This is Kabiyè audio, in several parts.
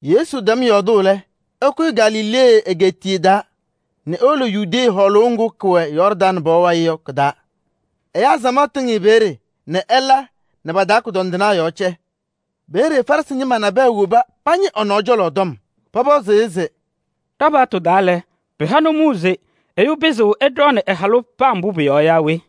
Yesu tɛm yɔɔdʋʋ lɛ, ɛkʋyɩ Galilee egeetiye taa nɛ ewolo Yudee hɔɔlʋʋ ŋgʋ kʋwɛ Yɔɔrdaŋ pɔɔ wayɩ yɔ kɩ-taa. Ɛyaa samaɣ tɩŋ-ɩ peeye nɛ ɛla nɛ pa-taa kʋdɔndɩnaa yɔɔ cɛ. Peeye Farɩsɩ ñɩma nabɛyɛ woba pañɩ ɛ-nɔɔ cɔlɔ tɔm. Pɔpɔzɩ-ɩ se: “Ɖa-paɣtʋ taa lɛ, pɩha nʋmɔʋ se ɛyʋ pɩzɩɣ ɛɖɔɔnɩ ɛ-halʋ paa mbʋ pʋ-yɔɔ yaa we?”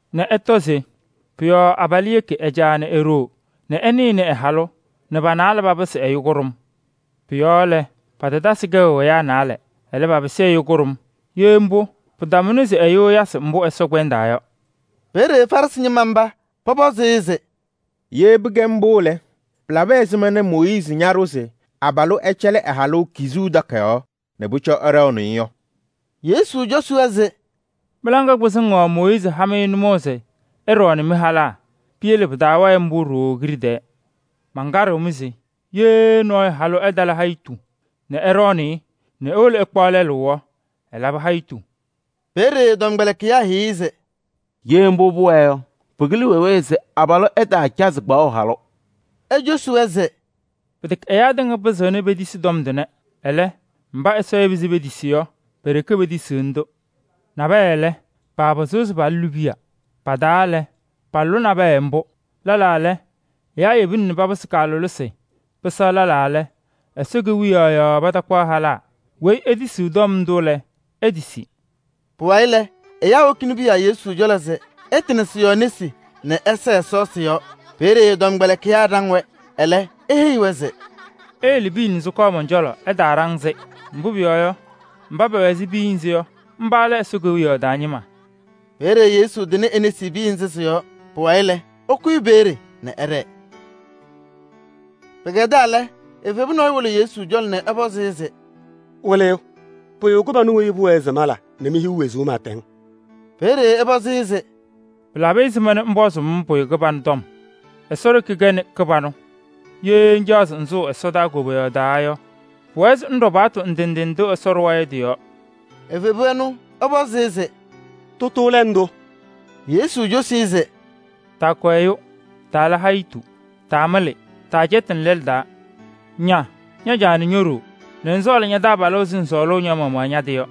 nɛ ɛtɔ se: pʋ-yɔɔ abalʋ yeki ɛ-caa nɛ e-ɖoo nɛ ɛnɩnɩ ɛ-halʋ nɛ pa-naalɛ papɩsɩ ɛyʋ kʋɖʋm.’ Pʋ-yɔɔ lɛ, patatasɩ kɛʋ ɛyaa naalɛ. Ɛlɛ, papɩsɩ ɛyʋ kʋɖʋm. Ye mbʋ, pɩtamʋna se ɛyʋ ɛyasɩ mbʋ Ɛsɔ kpɛndaa yɔ.” Peeye Farɩsɩ ñɩma mba pɔpɔzɩ-ɩ se: “Ye pɩkɛ mbʋ lɛ, pɩlabɩ ɛzɩma nɛ Mooyiizi ñaɖʋ se abalʋ ɛcɛlɩ ɛ-halʋ kizuu takayaɣ nɛ ɛɖɔɔnɩ-ɩ yɔ?” Yesu cosi-wɛ se: “Mɩ-laŋa kpɩzɩŋ yɔɔ Mooyiizi ha-mɩ nʋmɔʋ se ɩɖɔɔnɩ mɩ-halaa. Piyele pɩtaawɛɛ mbʋ ɖooo kiɖe tɛɛ. Mankaɖɩɣ-mɩ se: ye nɔɔyʋ halʋ ɛtala hayɩtʋ nɛ ɛɖɔɔnɩ-ɩ nɛ ewolo ɛkpaɣ lɛlʋ yɔ, ɛlabɩ hayitu.” Peeye ɛ-tɔmkpɛlɩkɩyaa heyi-i se: “Ye mbʋ pʋwɛɛ yɔ, pɩkɩlɩ wee wee se abalʋ ɛtaacazɩ kpaɣʋ halʋ.” Ecosi-wɛ se: “Pɩtɛkɛ ɛyaa tɩŋa pɩzɩɣna petisi tɔm tʋnɛ. Ɛlɛ, mba Ɛsɔ yeba se petisi yɔ, pe-ɖeke petisiɣni-tʋ. Nabɛyɛ wɛɛ, paapɩzɩɣ se palʋlɩ piya: pa-taa lɛ, palʋlɩ nabɛyɛ mbʋ. Lɛlaa lɛ, ɛyaa yebina nɛ papɩsɩ aleɣna, pɩsɛɣ lɛlaa lɛ, Ɛsɔ Kewiyaɣ yɔɔ patakpaɣ halaa. Weyi etisiɣ tɔm ndʋ lɛ, etisi.” Pʋwayɩ lɛ, ɛyaa wokini piya Yesu cɔlɔ se ɛtɩnɩ sɩ-yɔɔ nesi nɛ ɛsɛɛ Ɛsɔ sɩ-yɔɔ. Peeye ɛ-tɔmkpɛlɩkɩyaa ɖaŋ-wɛ. Ɛlɛ, eheyi-wɛ se: “Iyele piya nɛ sɩkɔɔ mɔn-cɔlɔ, ɩtaaɖaŋ-sɩ. Mbʋ pʋyɔɔ yɔ, mba pɛwɛ ɛzɩ piya nzɩ yɔ, mba lɛ Ɛsɔ Kewiyaɣ taa ñɩma.” Peeye Yesu tɩnɩ e-nesi piya nzɩ sɩ-yɔɔ. Pʋwayɩ lɛ, ɛkʋyɩ peeye nɛ ɛɖɛɛ. Pɩkɛdaa lɛ, evebu nɔɔyʋ wolo Yesu cɔlɔ nɛ ɛpɔzɩ-ɩ se: “Wɩlɩyʋ! Pʋyʋ kɩbanʋ weyi pʋwɛɛ se mala nɛ mehiɣ wezuu pɩɩtɛŋ?” Peeye ɛpɔzɩ-ɩ se: “Pɩlabɩ ɛzɩma nɛ ŋpɔzʋʋ-m pʋyʋ kɩbanʋ tɔm? Ɛsɔ ɖeke kɛnɩ kɩbanʋ. Ye ŋcaɣ se ŋsʋʋ ɛsɔdaa koboyaɣ taa yɔ, pʋwɛɛ se ŋɖɔ paɣtʋ ndʋ ndʋ Ɛsɔ ɖʋwa yɔ tɩ-yɔɔ.” Evebu ɛnʋ ɛpɔzɩ-ɩ se: “Tʋtʋ lɛ ndʋ?” Yesu cosi-i se: “Taakʋ ɛyʋ, taala hayitu, taamɩlɩ, taacɛtɩnɩ lɛlʋ taa, ña ña-caa nɛ ño-ɖoo nɛ ŋsɔɔlɩ ña-taabalʋ ɛzɩ ŋsɔɔlʋʋ ña-maɣmaɣ ña-tɩ yɔ.”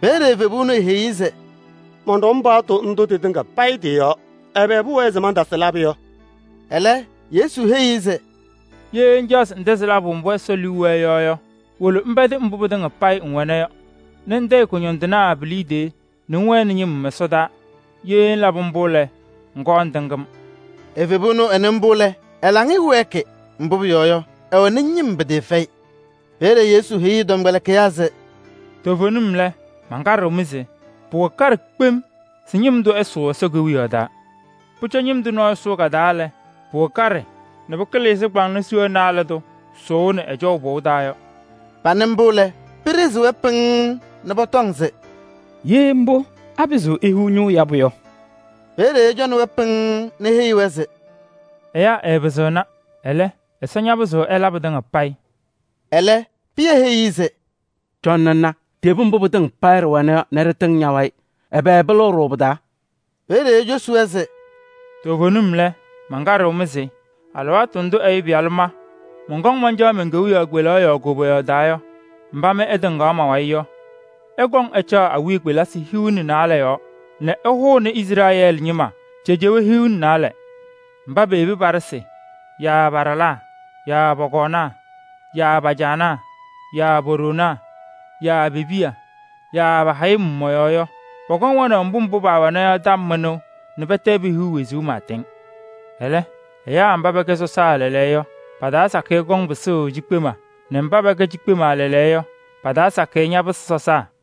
Peeye evebu ɛnʋ eheyi-i se: “Mɔnɖɔm paɣtʋ ndʋ tɩtɩŋa payɩ tɩ-yɔɔ. Ɛbɛ pʋwɛɛ se mantasɩ labʋ yɔ?” Ɛlɛ, Yesu heyi-i se: “Ye ŋcaɣ se ŋtɛzɩ labʋ mbʋ Ɛsɔ liu wɛɛ yɔ yɔ, wolo ŋpɛdɩ mbʋ pɩtɩŋa payɩ ŋwɛna yɔ nɛ ŋtayɩ kʋñɔndɩnaa pi-liidiye nɛ ŋwɛnɩ ñɩm ɛsɔdaa. Ye ŋlabɩ mbʋ lɛ, ŋkɔɔ ŋtɩŋ-m.” Evebu ɛnʋ ɛnɩ mbʋ lɛ, ɛ-laŋɩyɛ wɛɛkɩ, mbʋ pʋyɔɔ yɔ, ɛwɛnɩ ñɩm pɩtɩɩfɛyɩ. Peeye Yesu heyi ɛ-tɔmkpɛlɩkɩyaa se: “Toovenim lɛ, mankaɖɩɣ-mɩ se: pʋwɛ kaɖɛ kpem se ñɩm tʋ ɛsʋʋ Ɛsɔ Kewiyaɣ taa. Pʋcɔ ñɩm tʋ nɔɔyʋ sʋʋ ka-taa lɛ, pʋwɛ kaɖɛ nɛ pɩkɩlɩ ɛzɩ kʋyʋndʋʋ kpaŋnɔ sʋʋʋnɩ ɛjɔʋ pɔʋ taa yɔ.” Panɩ mbʋ lɛ, pɩɖɩɣzɩ-wɛ pɩŋŋ nɛ pɔtɔŋ se: “Ye mbʋ, apɩzɩɣ ehiɣ ñʋʋ yabʋ yɔ?” Peeye ɛcɔnɩ-wɛ pɩŋŋ nɛ eheyi-wɛ se: “Ɛyaa ɛɛpɩzɩɣna, ɛlɛ, Ɛsɔ ñapɩzɩɣ ɛla pɩtɩŋa payɩ.” Ɛlɛ, Pɩyɛ heyi-i se: “Cɔnɩ ŋna ɖiyebi mbʋ pɩtɩŋa payɩ ɖɩwɛna yɔ nɛ ɖɩtɩŋ ña-wayɩ. Ɛbɛ pɩlɩɣ-ɖʋ pɩ-taa?” Peeye ecosi-wɛ se: “Toovenim lɛ, mankaɖɩɣ-mɩ se alɩwaatʋ ndʋ Ɛyʋ Pɩyalʋ ma mɔnkɔŋ mancaɣ men-kewiyaɣ kpelaɣ yɔɔ koboyaɣ taa yɔ, mba mɩ ɩtɩŋaɣ ma-wayɩ yɔ, ɩkɔŋ caɣʋ awiya kpelisi hiu nɛ naalɛ yɔɔ nɛ ɩhʋnɩ Izrɛɛlɩ ñɩma cejewee hiu nɛ naalɛ. Mba peyebi pa-ɖɩsɩ yaa pa-ɖalaa yaa pɔ-kɔɔnaa yaa pa-caanaa yaa po-ɖoonaa yaa pe-piya yaa pa-hayɩm mɔ-yɔɔ yɔ, pɔkɔŋ wɛnaʋ mbʋ mbʋ paawɛna yɔ tɔm mɩnʋʋ nɛ pɛtɛ pehiɣ wezuu pɩɩtɛŋ. “Ɛlɛ, ɛyaa mba pɛkɛ sɔsaa lɛɛlɛɛyɔ yɔ, pa-taa sakɩyɛ kɔŋ pɩsʋʋ cikpema nɛ mba paba kɛ cikpema lɛɛlɛɛyɔ yɔ, pa-taa sakɩyɛ ñapɩsɩ sɔsaa.”